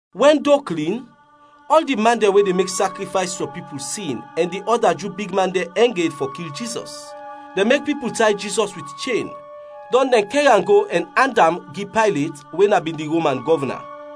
Wɛn do klin, ɔl di man dɛn we de mek sakrifays fɔ pipul sin ɛn di ɔda Ju big man dɛn ɛng ed fɔ kil Jizɔs. Dɛn mek pipul tay Jizɔs wit chen, dɔn dɛn kɛr am go ɛn and am gi Paylet we na bin di Roman gɔvna.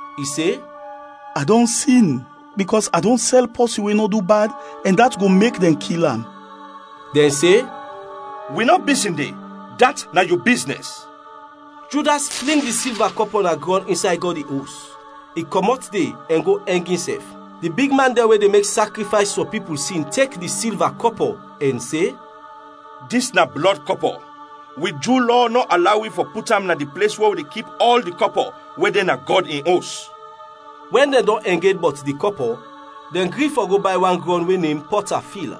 I se, “A dɔn sin, bikɔs a dɔn sɛl pɔsin we nɔ du bad ɛn dat go mek dɛn kil am.” Dɛn se, “Wi nɔ bisin de, dat na yu biznɛs.” Judas fling di silva kɔpɔ na grɔn insay Gɔd in Os, i kɔmɔt de, ɛn go ɛng insɛf. Di bigman dɛn we de mek sakrifays fɔ pipul sin tek di silva kɔpɔ ɛn se, “Dis na blɔd kɔpɔ, wi Ju Lɔ nɔ alaw wi fɔ put am na di ples we wi de kip ɔl di kɔpɔ we de na Gɔd in Os.” Wɛn dɛn dɔn ɛng ed bɔt di kɔpɔ, dɛn gri fɔ go bay wan grɔn we nem “Pɔta Fil,”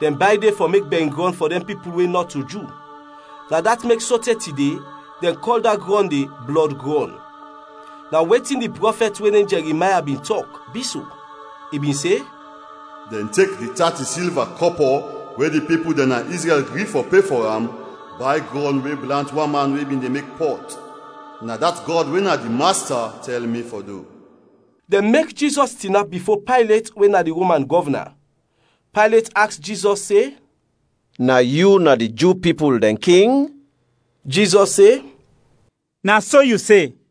dɛn bay de fɔ mek bɛringrɔn fɔ dɛn pipul we nɔto Ju. Na dat mek sote tide, dɛn kɔl da grɔn de “Blɔd Grɔn.” Na wetin di prɔfɛt we nem Jɛrimaya bin tɔk, bi so, i bin se, “Dɛn tek di tati silva kɔpɔ we di pipul dɛn na Izrɛl gri fɔ pe fɔ am, bay grɔn we blant wan man we bin de mek pɔt, na dat Gɔd we na di Masta tɛl mi fɔ du.” Dɛn mek Jizɔs tinap bifo Paylet we na di Roman gɔvna, Paylet aks Jizɔs se, “Na yu na di Ju pipul dɛn king?” Jizɔs se, “Na so yu se.”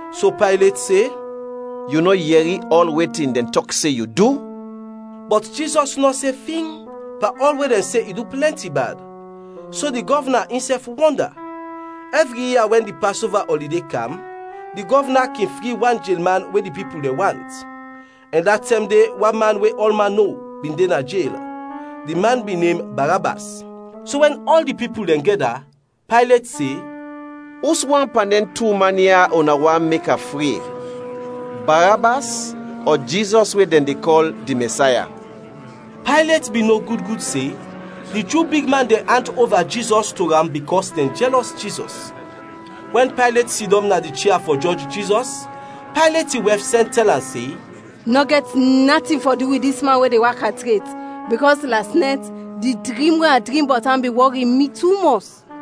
So Paylet se, “Yu nɔ yɛri ɔl wetin dɛn tɔk se yu du?” Bɔt Jizɔs nɔ se fing pan ɔl we dɛn se i du plɛnti bad; so di gɔvna insɛf wɔnda. Ɛvri ia wɛn di Pasova ɔlide kam, di gɔvna kin fri wan jelman we di pipul dɛn want. Ɛn da tɛm de wan man we ɔlman no, bin de na jel, di man bin nem Barabas. So wɛn ɔl di pipul dɛn gɛda, Paylet se, “Uswan pan dɛn tu man ya una want mek a fri, Barabas ɔ Jizɔs we dɛn de kɔl di Mɛsaya?” Paylet bin no gud gud se, di Ju bigman dɛn and ova Jizɔs to am bikɔs dɛn jɛlɔs Jizɔs. Wɛn Paylet sidɔm na di chia fɔ jɔj Jizɔs, Paylet in wɛf sɛn tɛl am se, “Nɔ gɛt natin fɔ du wit dis man we de waka tret, bikɔs las nɛt di drim we a drim bɔt am bin wɔri mi tumɔs.”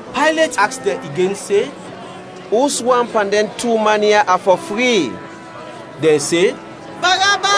Paylet aks dɛn igen se, “Uswan pan dɛn tu man ya a fɔ fri?” Dɛn se, “Barabas!”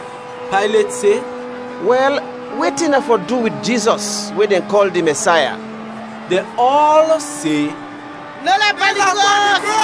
Paylet se, “Wɛl, wetin a fɔ du wit Jizɔs we dɛn kɔl di Mɛsaya?” Dɛn ɔl se, “Nel am pan di krɔs!”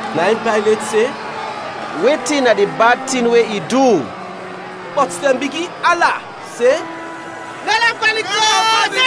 Na in Paylet se, “Wetin na di bad tin we i du?” Bɔt dɛn bigin ala se, “Nel am pan di krɔs!”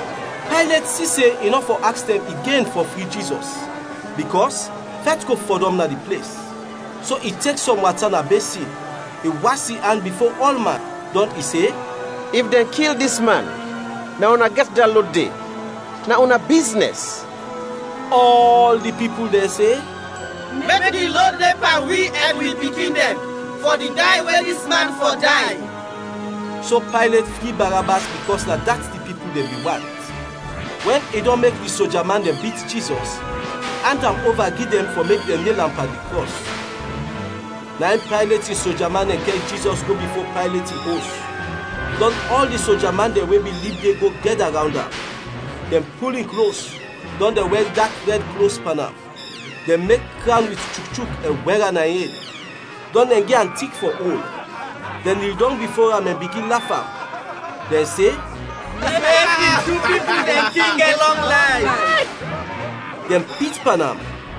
Paylet si se i nɔ fɔ aks dɛn igen fɔ fri Jizɔs, bikɔs fɛt go fɔdɔm na di ples; so i tek sɔm wata na besin, i was in an bifo ɔlman, dɔn i se, “If dɛn kil dis man, na una gɛt da lod de! Na una biznɛs.” Ɔl di pipul dɛn se, “Mek di lod de pan wi ɛn wi pikin dɛn fɔ di day we dis man fɔ day!” So Paylet fri Barabas bikɔs na dat di pipul dɛn bin want. Wɛn i dɔn mek di soja man dɛn bit Jizɔs, i and am ova gi dɛn fɔ mek dɛn nel am pan di krɔs. Na in Paylet in soja man dɛn kɛr Jizɔs go bifo Paylet in os, dɔn ɔl di soja man dɛn we bin lib de go gɛda rawnd am. Dɛn pul in klos, dɔn dɛn wɛr dak rɛd klos pan am. Dɛn mek krawn wit chukchuk ɛn wɛr am na in ed; dɔn dɛn gi am tik fɔ ol. Dɛn nil dɔng bifo am ɛn bigin laf am, dɛn se, “Mek di Ju pipul dɛn King gɛt lɔng layf!” Dɛn pit pan am,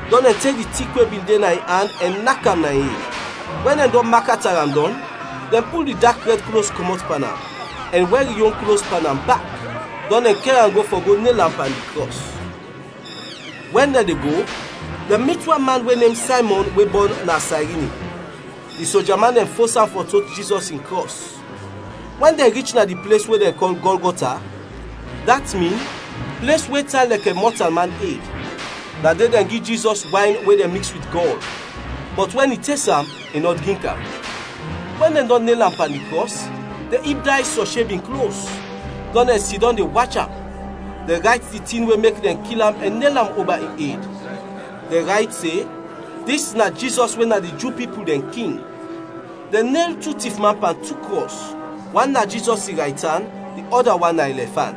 dɔn dɛn tek di tik we bin de na in an ɛn nak am na in ed. Wɛn dɛn dɔn makata am dɔn, dɛn pul di dak rɛd klos kɔmɔt pan am, ɛn wɛr in yon klos pan am bak, dɔn dɛn kɛr am go fɔ go nel am pan di krɔs. Wɛn dɛn de go, dɛn mit wan man we nem Saymɔn we bɔn na Sayrini, di soja man dɛn fos am fɔ tot Jizɔs in krɔs. Wɛn dɛn rich na di ples we dɛn kɔl Gɔlgɔta, dat min “Ples we tan lɛkɛ mɔtalman ed”, na de dɛn gi Jizɔs wayn we dɛn miks wit gɔl, bɔt wɛn i tes am, i nɔ drink am. Wɛn dɛn dɔn nel am pan di krɔs, dɛn ib days fɔ sheb in klos. Dɔn dɛn sidɔm de wach am. Dɛn rayt di tin we mek dɛn kil am ɛn nel am oba in ed, dɛn rayt se, “Dis na Jizɔs we na di Ju pipul dɛn King.” Dɛn nel tu tifman pan tu krɔs, wan na Jizɔs in raytan, di ɔda wan na in lɛfan.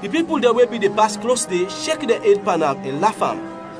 Di pipul dɛn we bin de pas klos de, shek dɛn ed pan am ɛn laf am.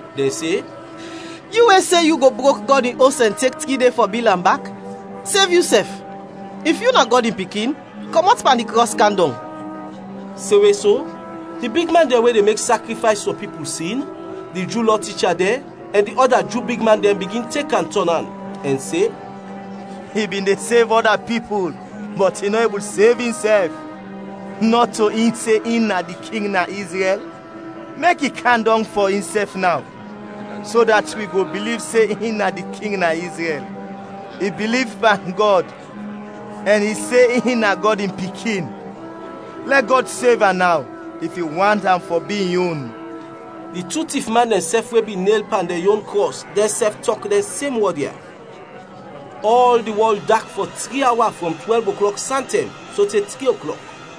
Dɛn se, “Yu we se yu go brok Gɔd in Os ɛn tek tri de fɔ bil am bak, sev yusɛf! If yu na Gɔd in Pikin, kɔmɔt pan di krɔs kam dɔng!” Semwe so, di bigman dɛn we de mek sakrifays fɔ pipul sin, di Ju Lɔ ticha dɛn, ɛn di ɔda Ju bigman dɛn bigin tek am tɔn an, ɛn se, “I bin de sev ɔda pipul, bɔt i nɔ ebul sev insɛf! Nɔto in se in na di king na Izrɛl? Mek i kam dɔng fɔ insɛf naw, so dat wi go biliv se in na di king na Izrɛl! I biliv pan Gɔd ɛn i se in na Gɔd in Pikin. Lɛ Gɔd sev am naw if i want am fɔ bi in yon!” Di tu tifman dɛnsɛf we bin nel pan dɛn yon krɔs, dɛnsɛf tɔk dɛn sem wɔd ya. Ɔl di wɔl dak fɔ tri awa frɔm twɛlv oklɔk santɛm sote tri oklɔk.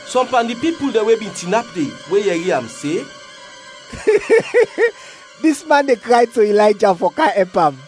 Sɔm pan di pipul dɛn we bin tinap de, we yɛri am, se, “Dis man de kray to Ilayja fɔ kam ɛp am.”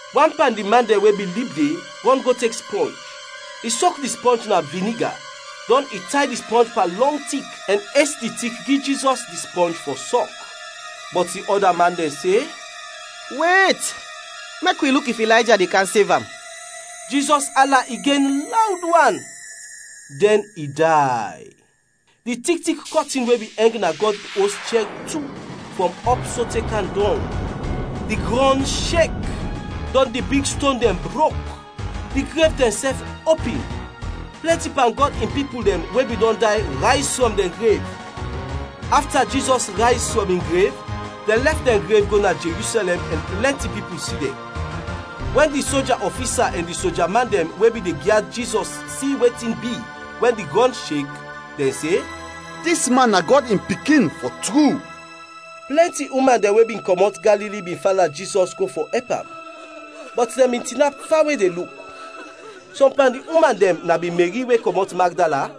Wan pan di man dɛn we bin lib de, rɔn go tek spɔnj, i sok di spɔnj na viniga, dɔn i tay di spɔnj pan lɔng tik ɛn es di tik gi Jizɔs di spɔnj fɔ sɔk. Bɔt di ɔda man dɛn se, “Wet, mek wi luk if Ilayja de kam sev am!” Jizɔs ala igen lawd wan, dɛn i day. Di tik tik kɔtin we bin ɛng na Gɔd in Os chɛr tu, frɔm ɔp sote kam dɔng. Di grɔn shek, dɔn di big ston dɛn brok. Di grev dɛnsɛf opin; plɛnti pan Gɔd in pipul dɛn we bin dɔn day rayz frɔm dɛn grev. Afta Jizɔs rayz frɔm in grev, dɛn lɛf dɛn grev go na Jerusɛlɛm, ɛn plɛnti pipul si dɛn. Wɛn di soja ɔfisa ɛn di soja man dɛn we bin de gyad Jizɔs si wetin bi wɛn di grɔn shek, dɛn se, “Dis man na Gɔd in Pikin, fɔ tru!” Plɛnti uman dɛn we bin kɔmɔt Galili bin fala Jizɔs go fɔ ɛp am, bɔt dɛn bin tinap fawe de luk. Sɔm pan di uman dɛn na bin Meri we kɔmɔt Magdala,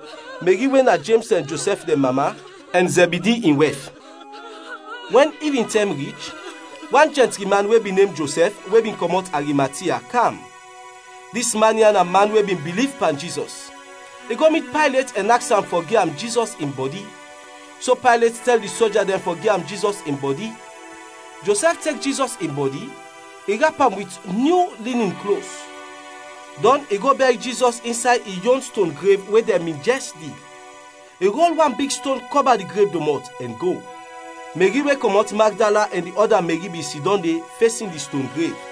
Meri we na Jems ɛn Josɛf dɛn mama, ɛn Zɛbidi in wɛf. Wɛn ivintɛm rich, wan jɛntri man we bin nem Josɛf we bin kɔmɔt Arimatia, kam. Dis man ya na man we bin biliv pan Jizɔs. I go mit Paylet ɛn aks am fɔ gi am Jizɔs in bɔdi. So Paylet tɛl di soja dɛn fɔ gi am Jizɔs in bɔdi. Josɛf tek Jizɔs in bɔdi, i rap am wit nyu linin klos, dɔn i go bɛr Jizɔs insay in yon ston grev we dɛn bin jɛs dig. I rol wan big ston kɔba di grev domɔt, ɛn go. Meri we kɔmɔt Magdala ɛn di ɔda Meri bin sidɔm de, fesin di ston grev.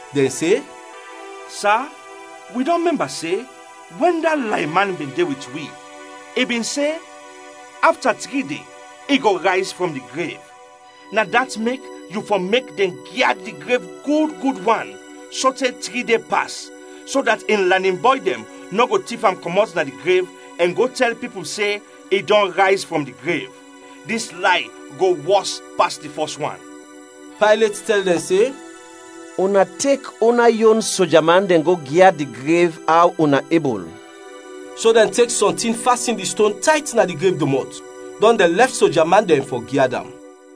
Dɛn se, “Sa, wi dɔn mɛmba se, wɛn da layman bin de wit wi, i bin se afta tri de i go rayz frɔm di grev. Na dat mek yu fɔ mek dɛn gyad di grev gud gud wan sote tri de pas, so dat in lanin bɔy dɛn nɔ go tif am kɔmɔt na di grev ɛn go tɛl pipul se i dɔn rayz frɔm di grev. Dis lay go wɔs pas di fɔs wan.” Paylet tɛl dɛn se, “Una tek una yon sojaman dɛn go gyad di grev aw una ebul.” So dɛn tek sɔntin fasin di ston tayt na di grev domɔt, dɔn dɛn lɛf soja man dɛn fɔ gyad am.